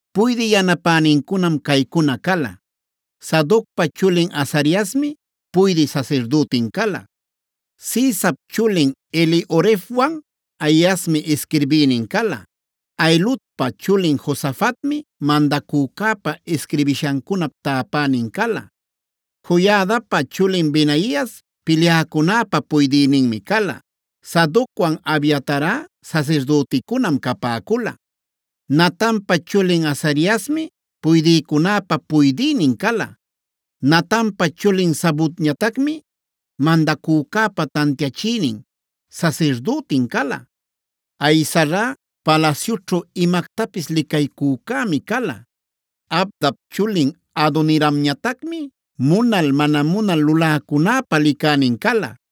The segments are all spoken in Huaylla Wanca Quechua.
Puydï yanapänincunam caycuna cala: Sadocpa chulin Azariasmi puydï sasirdütin cala. Sisap chulin Elihorefwan Ahiasmi isquirbïnin cala. Ahiludpa chulin Josafatmi mandacücäpa isquirbishancunap täpänin cala. Joiadapa chulin Benaias pilyäcunäpa puydïninmi cala. Sadocwan, Abiatarꞌa sasirdüticunam capäcula. Natanpa chulin Azariasmi puydïcunäpa puydïnin cala. Natanpa chulin Zabudñatacmi mandacücäpa tantiachïnin, sasirdütin cala. Ahisarꞌa palasyućhu imactapis licaycücämi cala. Abdap chulin Adoniramñatacmi munal mana munal luläcunäpa licänin cala.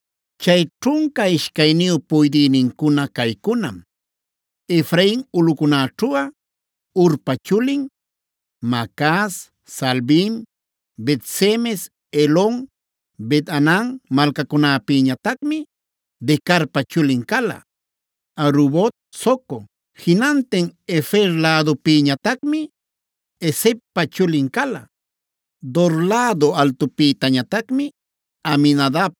Chay ćhunca ishcayniyu puydïnincuna caycunam: Efrain ulꞌucunäćhuꞌa Hurpa chulin. Macaz, Saalbim, Bet-semes, Elon, Bet-hanan malcacunäpïtañatacmi Decarpa chulin cala. Arubot, Soco, jinantin Hefer lädupïtañatacmi Hesedpa chulin cala. Dora lädu altupïtañatacmi Abinadab;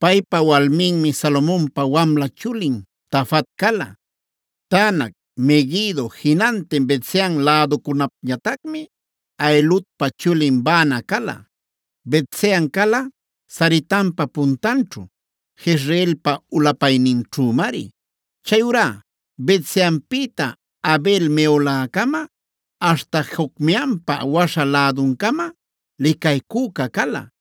paypa walminmi Salomonpa wamla chulin Tafat cala. Taanac, Meguido, jinantin Bet-sean läducunapñatacmi Ahiludpa chulin Baana cala. Bet-sean cala Saretanpa puntanćhu, Jezreelpa ulapayninćhümari. Chayurá Bet-seanpïta Abel-meholacama, aśhta Jocmeampa waśha läduncamam licaycüca cala.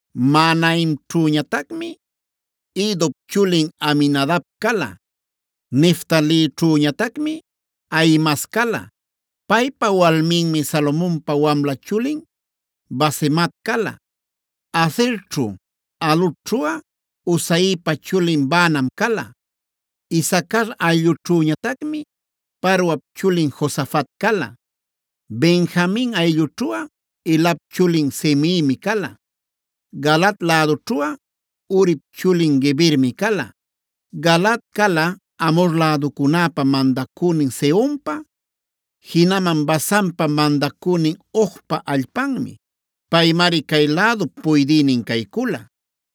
Mahanaimćhüñatacmi Iddop chulin Ahinadab cala. Neftalićhüñatacmi Ahimaas cala. Paypa walminmi Salomonpa wamla chulin Basemat cala. Aserćhu, Alotćhuꞌa Husaipa chulin Baanam cala. Isacar ayllućhüñatacmi Paruap chulin Josafat cala. Benjamin ayllućhuꞌa Elap chulin Simeimi cala. Galaad lädućhuꞌa Urip chulin Gebermi cala. Galaad cala Amhor läducunäpa mandacünin Sehonpa, jinaman Basanpa mandacünin Ogpa allpanmi. Paymari cay lädup puydïnin caycula.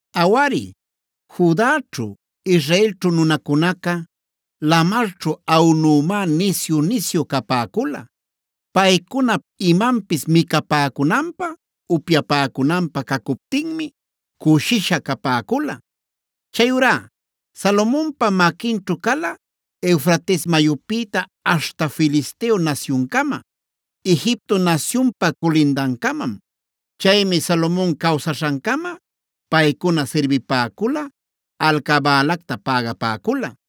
Awari, Judaćhu, Israelćhu nunacunaca lamarćhu aꞌunümi nisyu-nisyu capäcula. Paycunap imanpis micapäcunanpä, upyapäcunanpä cacuptinmi cushisha capäcula. Chayurá Salomonpa maquinćhu cala Eufrates mayupïta aśhta Filisteo nasyuncama, Egipto nasyunpa culindancamam.b Chaymi Salomon cawsaśhancama paycuna sirbipäcula, alcabälacta pägapäcula.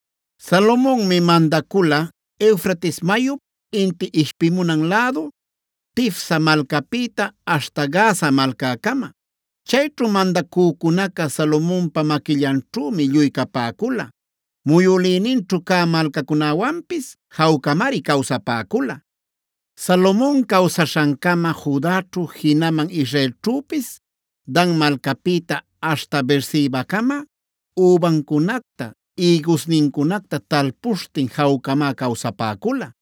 Salomonmi mandacula Eufrates mayup inti ishpimunan lädu Tifsa malcäpïta aśhta Gaza malcäcama. Chayćhu mandacücunaca Salomonpa maquillanćhümi lluy capäcula. Muyülïninćhu cä malcacunäwanpis jawcamari cawsapäcula. Salomon cawsaśhancama Judaćhu jinaman Israelćhüpis Dan malcäpïta aśhta Beersebacama übancunacta, ïgusnincunacta talpuśhtin jawcamá cawsapäcula.